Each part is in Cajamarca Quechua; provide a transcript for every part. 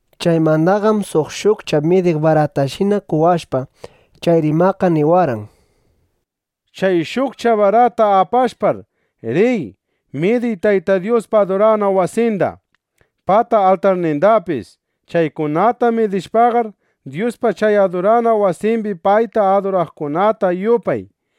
Chaymandaqam suq shukcha midiq baratashina qowashpa, chay rimaqqa niwarqan: —Chay shukcha barata apashpar, riy, midiy Tayta Dyuspa adurana wasinda, pata altarnindapis. Chaykunata midishpaqar, Dyuspa chay adurana wasimbi payta aduraqkunata yupay.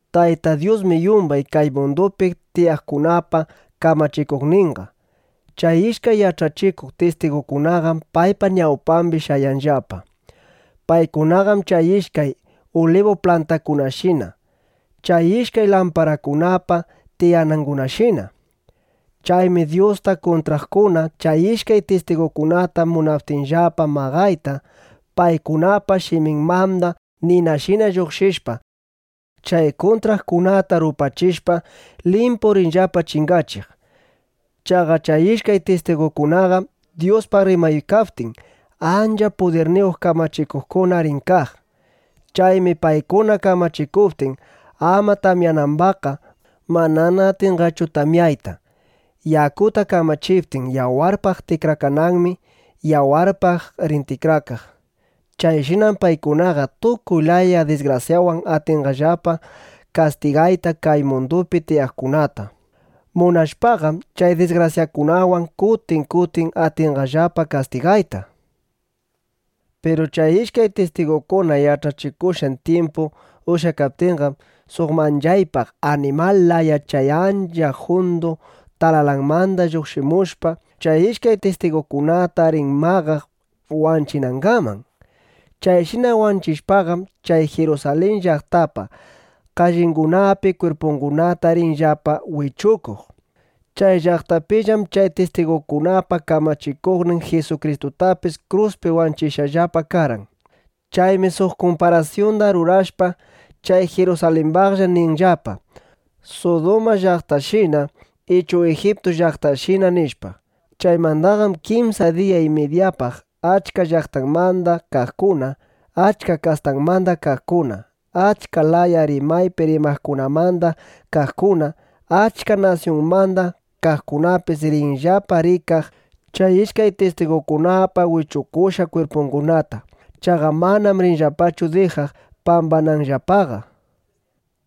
Tayta Dyusmi yumbay kay mundupi tiyaqkunapa kamachikuqninqa. Chay ishkay yach'achikuq tistigukunaqam paypa ñawpambi shayanllapa. Paykunaqam chay ishkay ulibu plantakunashina, chay ishkay lamparakunapa tiyanangunashina. Chaymi Dyusta kuntraqkuna chay ishkay tistigukunata munaptinllapa maqayta, paykunapa shiminmanda ninashina lluqshishpa, chay kuntraqkunata rupachishpa, limpu rinllapa chingachiq. Chaqa chay ishkay tistigukunaqam Dyuspaq rimaykaptin, ancha pudirniyuq kamachikuqkuna rin kaq. Chaymi paykuna kamachikuptin ama tamyanambaqqa, manana atinqachu tamyayta. Yakuta kamachiptin yawarpaq tikrakananmi, yawarpaq rin tikrakaq. Chayshinam paykunaqa tukuy laya disgrasyawan atinqallapa kastigayta kay mundupi tiyaqkunata. Munashpaqam, chay disgrasyakunawan kutin kutin atinqallapa kastigayta. Piru chay ishkay tistigukuna yach'achikushqan tyimpu ushyakaptinqam, suq manchaypaq animal laya chay ancha jundu talalanmanda lluqshimushpa, chay ishkay tistigukunata rin maqaq wanchinangaman. Chayshina wanchishpaqam, chay Jirusalin llaqtapa kallingunapi kwirpungunata rinllapa wichukuq. Chay llaqtapillam chay tistigukunapa Kamachikuqnin Jisukristutapis kruspi wanchishqallapa karqan. Chaymi suq kumparasyunda rurashpa, chay Jirusalimbaqlla ninllapa: “Suduma llaqtashina” ichu “Ijiptu llaqtashina”, nishpa. Chaymandaqam kimsa diya y midyapaq achka llaqtamanda kaqkuna, achka kastamanda kaqkuna, achka laya rimaypi rimaqkunamanda kaqkuna, achka nasyunmanda kaqkunapis rinllapa rikaq chay ishkay tistigukunapa wichukushqa kwirpungunata. Chaqa manam rinllapachu dijaq pambananllapaqa.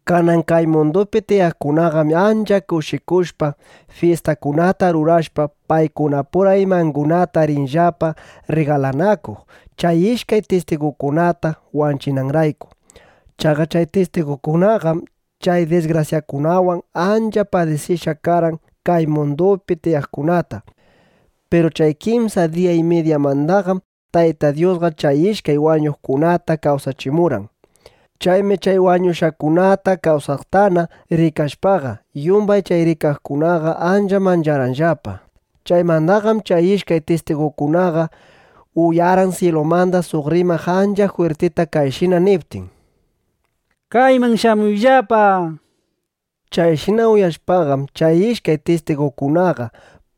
Kanan kay mundupi tiyaqkunaqam ancha kushikushpa, fyistakunata rurashpa, paykunapura imangunata rinllapa rrigalanakuq, chay ishkay tistigukunata wanchishqanrayku. Chaqa chay tistigukunaqam chay disgrasyakunawan ancha padisichishqa karqan kay mundupi tiyaqkunata. Piru chay kimsa diya y midyamandaqam Tayta Dyusqa chay ishkay wañushqakunata kawsachimurqan. Chaymi chay wañushqakunata kawsaqtana rikashpaqa, yumbay chay rikaqkunaqa ancha mancharqanllapa. Chaymandaqam chay ishkay tistigukunaqa uyarqan syilumanda suq rimaq ancha jwirtita kayshina niptin: —Kayman shamuyllapa, nishpa. Chayshina uyashpaqam, chay ishkay tistigukunaqa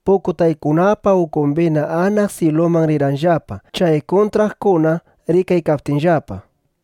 pukutaykunapa ukumbina anaq syiluman rirqanllapa, chay kuntraqkuna rikaykaptinllapa.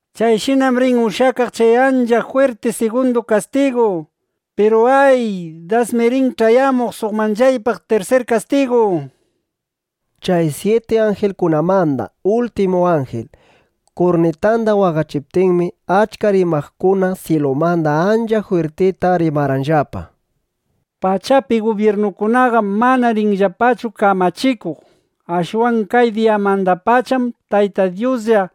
Chayshinam rin ushyakaq chay ancha jwirti sigundu kastigu. Piru, ¡ay! Dasmi rin ch'ayamuq suq manchaypaq tirsir kastigu. Chay syiti anjilkunamanda ultimu anjil kurnitanda waqachiptinmi, achka rimaqkuna syilumanda ancha jwirtita rimarqanllapa: Pachapi gubyirnukunaqam manana rinllapachu kamachikuq. Ashwan kay diyamandapacham Tayta Dyusqa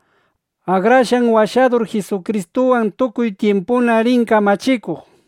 Akrashqan Washadur Jisukristuwan tukuy tyimpuna rin kamachikuq, nishpa.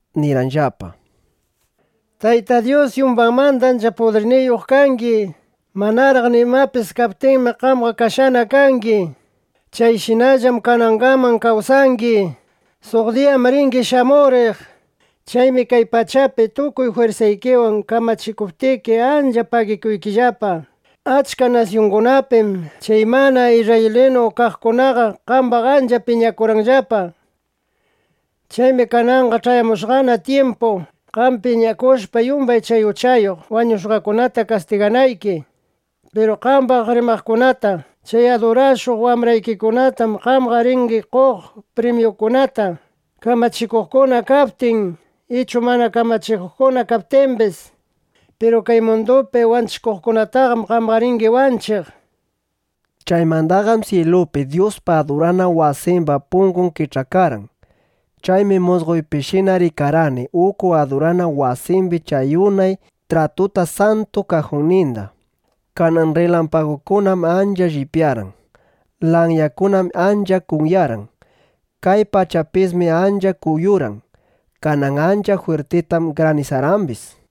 nirqanllapa: Tayta Dyus, yumbaymanda ancha pudirniyuq kangi. Manaraq nimapis kaptinmi, qamqa kashqana kangi. Chayshinallam kanangaman kawsaykangi. Suq diyam ringi shamuriq. Chaymi kay pachapi tukuy jwirsaykiwan kamachikuptiki, ancha pagikuykillapa, Achka nasyungunapim chay mana isrraylinu kaqkunaqa qambaq ancha piñakurqanllapa. Chaymi kananqa ch'ayamushqana tyimpu, qam piñakushpa yumbay chay uchayuq wañushqakunata kastiganayki. Piru qambaq rimaqkunata, chay adurashuq wambraykikunatam qamqa ringi qoq primyukunata, kamachikuqkuna kaptin, ichu mana kamachikuqkuna kaptimbis. Piru kay mundupi wanchikuqkunataqam qamqa ringi wanchiq, nishpa. Chaymandaqam syilupi Dyuspa adurana wasimba pungun kich'akarqan. Chaymi musqoypishina rikarqani uku adurana wasimbi chay unay tratupa Santu Kajunninda. Kanan rrilampagukunam ancha lliwyarqan. Lanyakunam ancha kunyarqan. Kay pachapismi ancha kuyurqan. Kanan ancha jwirtitam granisarqambis.